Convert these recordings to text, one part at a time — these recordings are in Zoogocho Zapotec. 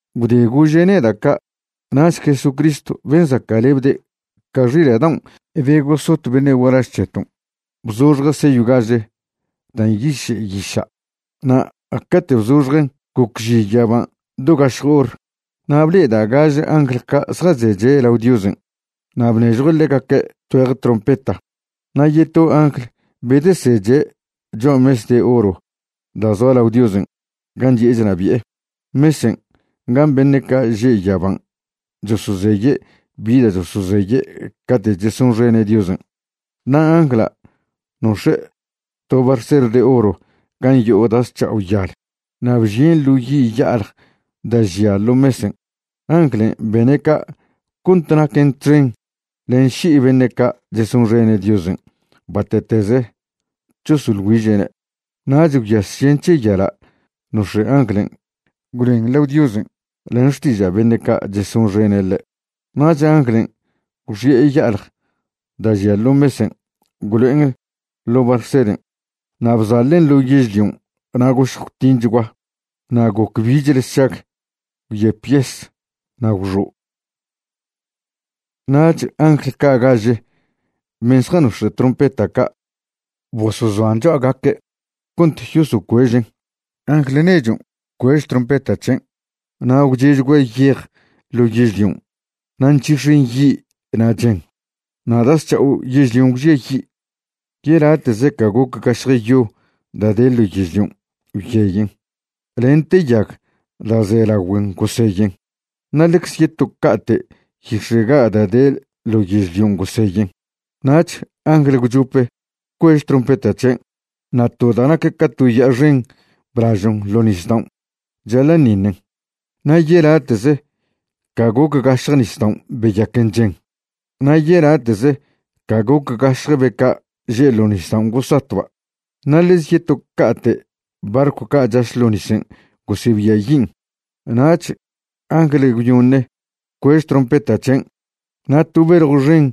Gwde gože' neda' ca', nach Jesucristw ben' zaca'lebde' ca xila' daon' be gosot beṉe' gualaž c̱heton' bzoxje' seyw gaže da' nyiše' yiša', na' cate' bzoxjen' gocži yaban' do gašj hor. Na' ble'eda' gaže angl ca' zjazeche' lao Diosen', na' bnežjue' ḻegaque' tgüeje trompeta. Na' yeto angl bedeseche' cho'a mes de oro da' zoa lao Diosen' gan' chi'e chnabi'e, mesen' gan' beṉe' ca' že' yaban' chosozeye' bi da' chosozeye' cate' chesonxene' Diosen'. Na' angla' nox̱e' to barser de oro gan' yo'o da' zc̱ha'o yal na' bžien' ḻo yi' ya'alj da' žia ḻo mesen'. Anglen' bene' ca' cont naquen txen len ši'i beṉe' ca' chesonxene' Diosen' bate'teze chosoḻ güiže'ne'. Nach gwyas žen c̱he yala' nox̱e' anglen' gwloen lao Diosen' len xtiža' beṉe' ca' chesonxene' ḻe'. Nach anglen' gwxi'e ya'alj da' žia ḻo mesen' gwlo'en ḻo' barseren' na' bzaḻen' ḻo yežlion' na' gošj gwtinchgua, na' goc bichle sšag, gwyep yes na' gwxo'. Nach angl ca' gaže ben' zjanox̱e' trompeta ca' bosozoan' cho'agaque' cont yosocuežen'. Angl nechon' bcuež trompeta c̱hen', na' gwche'chgua yej ḻo yežlion' na' nc̱hix̱en yi' na' chen. Na' da' zc̱ha'o yežlion' gwžiayi', yelate'ze ca goc gašje yo da' de ḻo yežlion' gwyeyen, lente yag da' ze lagüen goseyen, na' ḻecze yeto ca'ate' yix̱e' ga' da' de ḻo yežlion' goseyen. Nach angl gwchope bcuež trompeta c̱hen', na' to da' nac ca to ya'a xen blažon' ḻo' nisdaon' chaḻa'ṉiṉen. Na' yelate'ze ca goc gašje nisdaon' beyaquen chen. Na' yelate'ze ca goc gašje be ca' že' ḻo' nisdaon' gosatba', na' ḻeze yeto ca'te' barcw ca' chaš ḻo nisen' gosebiayin'. Nach angl gwyoṉe bcuež trompeta c̱hen' na' to beljw xen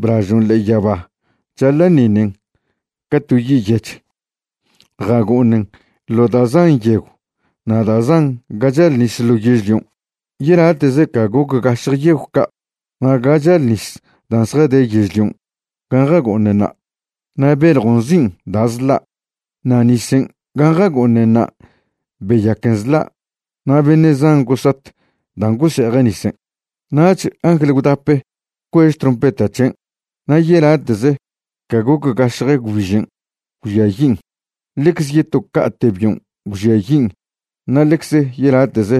blažon' ḻe'e yaba chaḻa'ṉiṉen ca to yi' yech. Jago'oṉen ḻo da' zan yegw na' da' zan ga chal nis ḻo yežlion', yelate'ze ca goc gašje yegw ca' na' ga chal nis dan' zjade yežlion' gan' jago'oṉenṉa'. Na' beljon' nzin' Da' Zḻa', na' nisen' gan' jago'oṉenṉa' beyaquen zḻa' na' beṉe' zan gosat dan' gose'eje' nisen'. Nach angl gwdape bcuež trompeta c̱hen' na' yelate'ze ca goc gašje gwbižen' gwžiayin', ḻecze yeto ca'te' bion' gwžiayin' na' ḻecze yelate'ze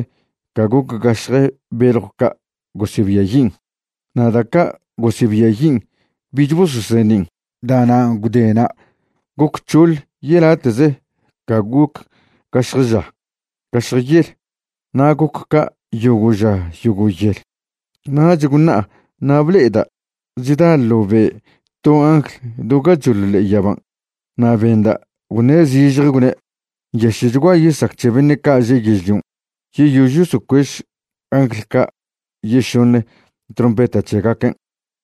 ca goc gašje beljw ca' gosebiayin'. Na' da' ca' gosebiayin' bich bososeṉin'. Da'nan' gwdena' goc c̱hoḻ yelate'ze ca goc gašj ža gašj yel, na goc ca' yogo' ža yogo' yel. Nach gwṉa'a na' ble'eda' chda ḻo be' to angl do gachoḻ ḻe'e yaban' na' benda' gwṉe' zižje, gwne': ―¡Nyaše'chgua yesac c̱he beṉe' ca' že' yežlion' yeyož yosocuež angl ca' yešoṉe trompeta c̱hegaquen'!